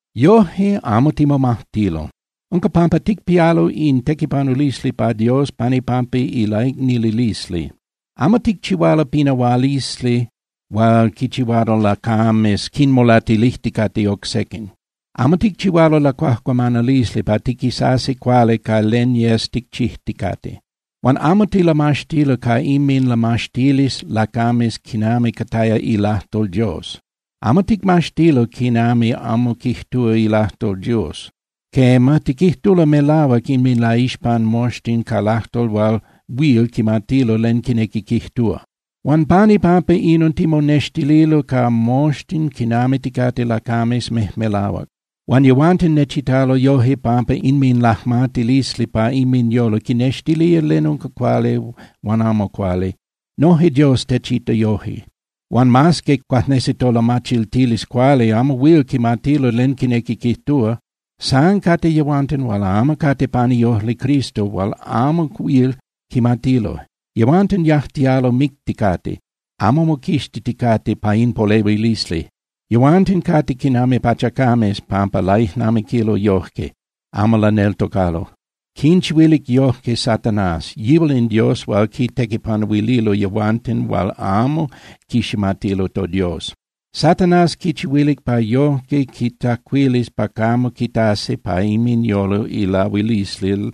Yoje, amo timomajtilo. Unca pampa ticpialo in tequipanulisli pa Dios pan ipampa ilaicnililisli. Amo ticchihualo pinahualisli hual quichihualo lacames quinmolatilijticate oc sequin. Amo ticchihualo lacuajcuamanalisli pa tiquisasi cuali ca len yes ticchijticate. Huan amo tilamaxtilo ca inminlamaxtilisli lacames quinami cataya ilajtol Dios. Amo ticmaxtilo quinami amo quijtúa ilajtol Dios. Quema, tiquijtulo melahuac inminlaixpan moxtin ca lajtol hual huil quimatilo len quinequi quijtúa. Huan pan ipampa inon timonextililo ca moxtin quinami ticate lacames mejmelahuac. Huan yehuanten nechitalo yoje pampa inminlajmatilisli pa inminyolo quinnextilía len unca cuali huan amo cuali. Noje Dios techita yoje. Huan mas que cuajnesi tolamachiltilisli cuali amo huil quimatilo len quinequi quijtúa, san cate yehuanten hual amo cate pan iojli Cristo hual amo huil quimatilo. Yehuanten yajtialo micticate, amo moquixtiticate pa in polehuilisli. Yehuanten cate quinami pachacames pampa laijnamiquilo yoje, amo laneltocalo. Quinchihuilic yojque Satanás, yihual in dios hual quitequipanuililo yehuanten hual amo quiximatilo toDios. Satanás quinchihuilic pa yojque quintzacuilis pa camo quitasi pa inminyolo ilahuilisli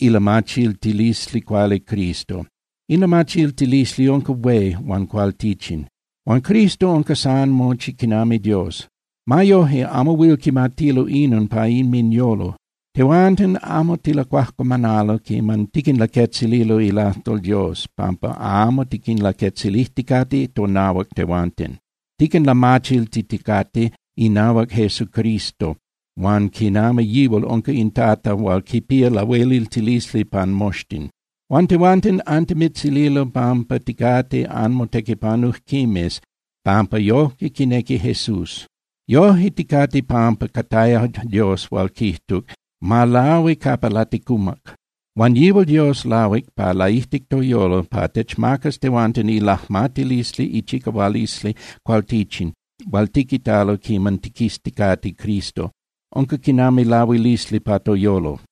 ilamachiltilisli cuali Cristo. In lamachiltilisli unca hué huan cualtichin. Huan Cristo unca san mochi quinami Dios. Ma yoje, amo huil quimatilo inon pa inminyolo. Tehuanten amo tilacuajcuamanalo quiman tiquinlaquetzililo ilajtol Dios, pampa amo tiquinlaquetzilijticate tonahuac tehuanten. Tiquinlamachiltiticate inahuac Jesucristo huan quinami yihual unca in Tata hual quipía lahueliltilisli pan moxtin. Huan tehuanten antimitzililo pampa ticate anmotequipanujquimes pampa yoje quinequi Jesús. Yoje ticate pampa cataya Dios hual quijtuc: “Ma lahui capa laticumac”, huan yihual Dios lahuic pa laijtic toyolo pa techmacas tehuanten ilajmatilisli ichicahualisli cualtichin hual tiquitalo quiman tiquizticate Cristo. Unca quinami lahuilisli pa toyolo.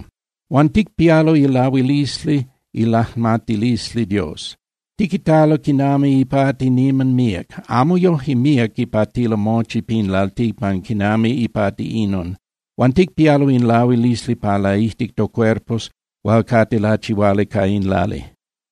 Huan ticpialo ilahuilisli ilajmatilisli Dios. Tiquitalo quinami ipati niman míac. Amo yoje míac ipatilo mochi pin lalticpan quinami ipati inon. Huan ticpialo in lahuilisli pa laijtic tocuerpos hual cate lachihuali ca in lali.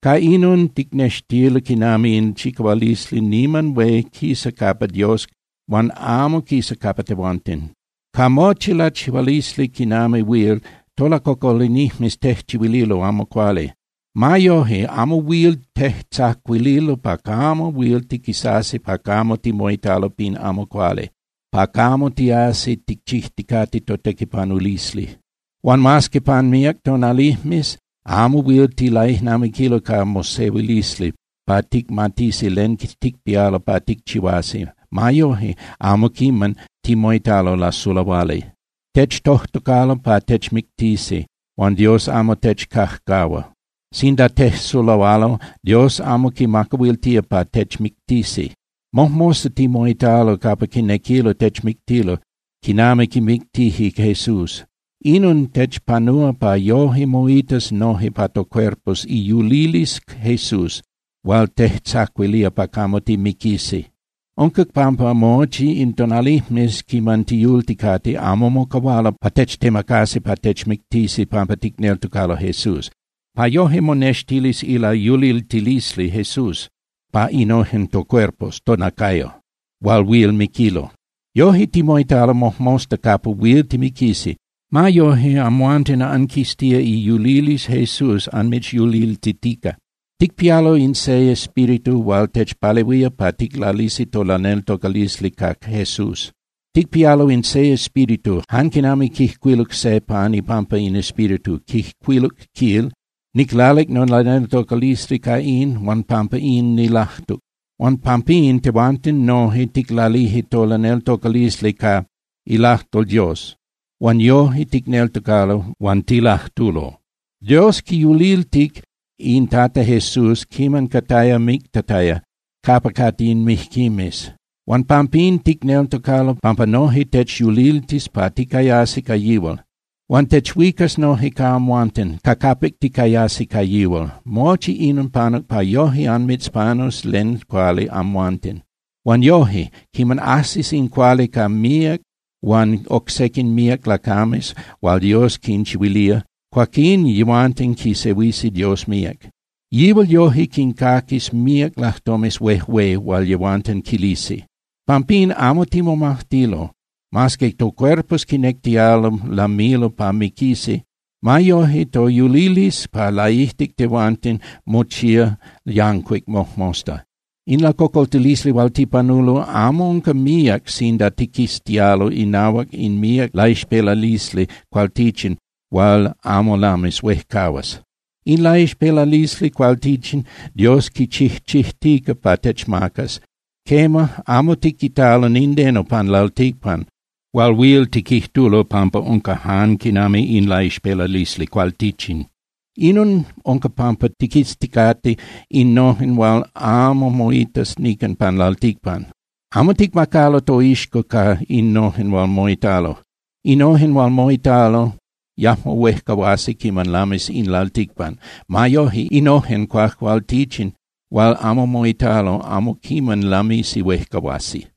Ca inon ticnextilo quinami in chicahualisli niman hué quisa capa Dios huan amo quisa capa tehuanten. Ca mochi lachihualisli quinami huil, tolacocolinijmes tejchihuililo amo cuali. Ma yoje, amo huil tejtzacuililo pa camo huil tiquisasi pa capa timoitalo pin amo cuali, pa camo tiasi ticchijticate totequipanulisli. Huan mas que pan míac tonalijmes amo huil tilaijnamiquilo ca mosehuilisli pa ticmatisi len ticpialo pa ticchihuasi, ma yoje, amo quiman timoitalo lasulahuali. Techtojtocalo pa techmictisi, huan Dios amo techcajcahua. Sinda tejsulahualo, Dios amo quinmacahuiltía pa techmictisi. Mojmosta timoitalo capa quinequilo techmictilo quinami quimictije Jesús. Inon techpanúa pa yoje moitas noje pa tocuerpos iyulilisli Jesús hual tejtzacuilía pa camo timiquisi. Unca pampa mochi in tonalijmes quiman tiyulticate, amo mocahualo pa techtemacasi pa techmictisi pampa ticneltocalo Jesús, pa yoje monextilis ilayuliltilisli Jesús pa innojen tocuerpos (tonacayo) hual huil miquilo. Yoje, timoitalo mojmosta capa huil timiquisi. Ma yoje, amhuanten anquiztía iyulilisli Jesús anmitzyuliltitica. Ticpialo in se Espíritu hual techpalehuía pa ticlalisi tolaneltocalisli ca Jesús. Ticpialo in se Espíritu, jan quinami quijcuiluc se pan ipampa in Espíritu, quijcuiluc, quil: “Niclalic nolaneltocalisli ca in, huan pampa inon nilajtuc.” Huan pampín tehuanten noje ticlalije tolaneltocalisli ca ilajtol Dios. Huan yoje ticneltocalo huan tilajtulo. Dios quiyuliltic in Tata Jesús quiman cataya mictataya capa cate in mijquimes. Huan pampín ticneltocalo pampa noje techyuliltis pa ticayasi ca yihual. Huan techuicas noje ca amhuanten ca capic ticayasi ca yihual. Mochi inon panuc pa yoje anmitzpanus len cuali amhuanten. Huan yoje, quiman ajsis in cuali ca míac huan oc sequin míac lacames hual Dios quinchihuilía, cuaquín yehuanten quisehuisi Dios míac. Yihual yoje quincaquis míac lajtomes huejué hual yehuanten quilisi. Pampín amo timomajtilo. Mas que tocuerpos quinectialo lamilo pa miquisi, ma yoje toyulilisli pa laijtic tehuanten mochía yancuic mojmosta. In lacocoltilisli hual tipanulo amo unca míac sinda tiquiztialo inahuac in míac laixpelalisli cualtichin hual amo lamis huejcahuas. In laixpelalisli cualtichin Dios quichijchijtica pa techmacas. Quema, amo tiquitalo nindeno pan lalticpan hual huil tiquijtulo pampa unca jan quinami in laixpelalisli cualtichin. Inon unca pampa tiquizticate innojen hual amo moitas nican pan lalticpan. Amo ticmacalo toixco ca innojen hual moitalo. Innojen hual moitalo yajmo huejcahuasi quiman lamis in lalticpan. Ma yoje, innojen cuajcualtichin hual amo moitalo amo quiman lamisi huejcahuasi.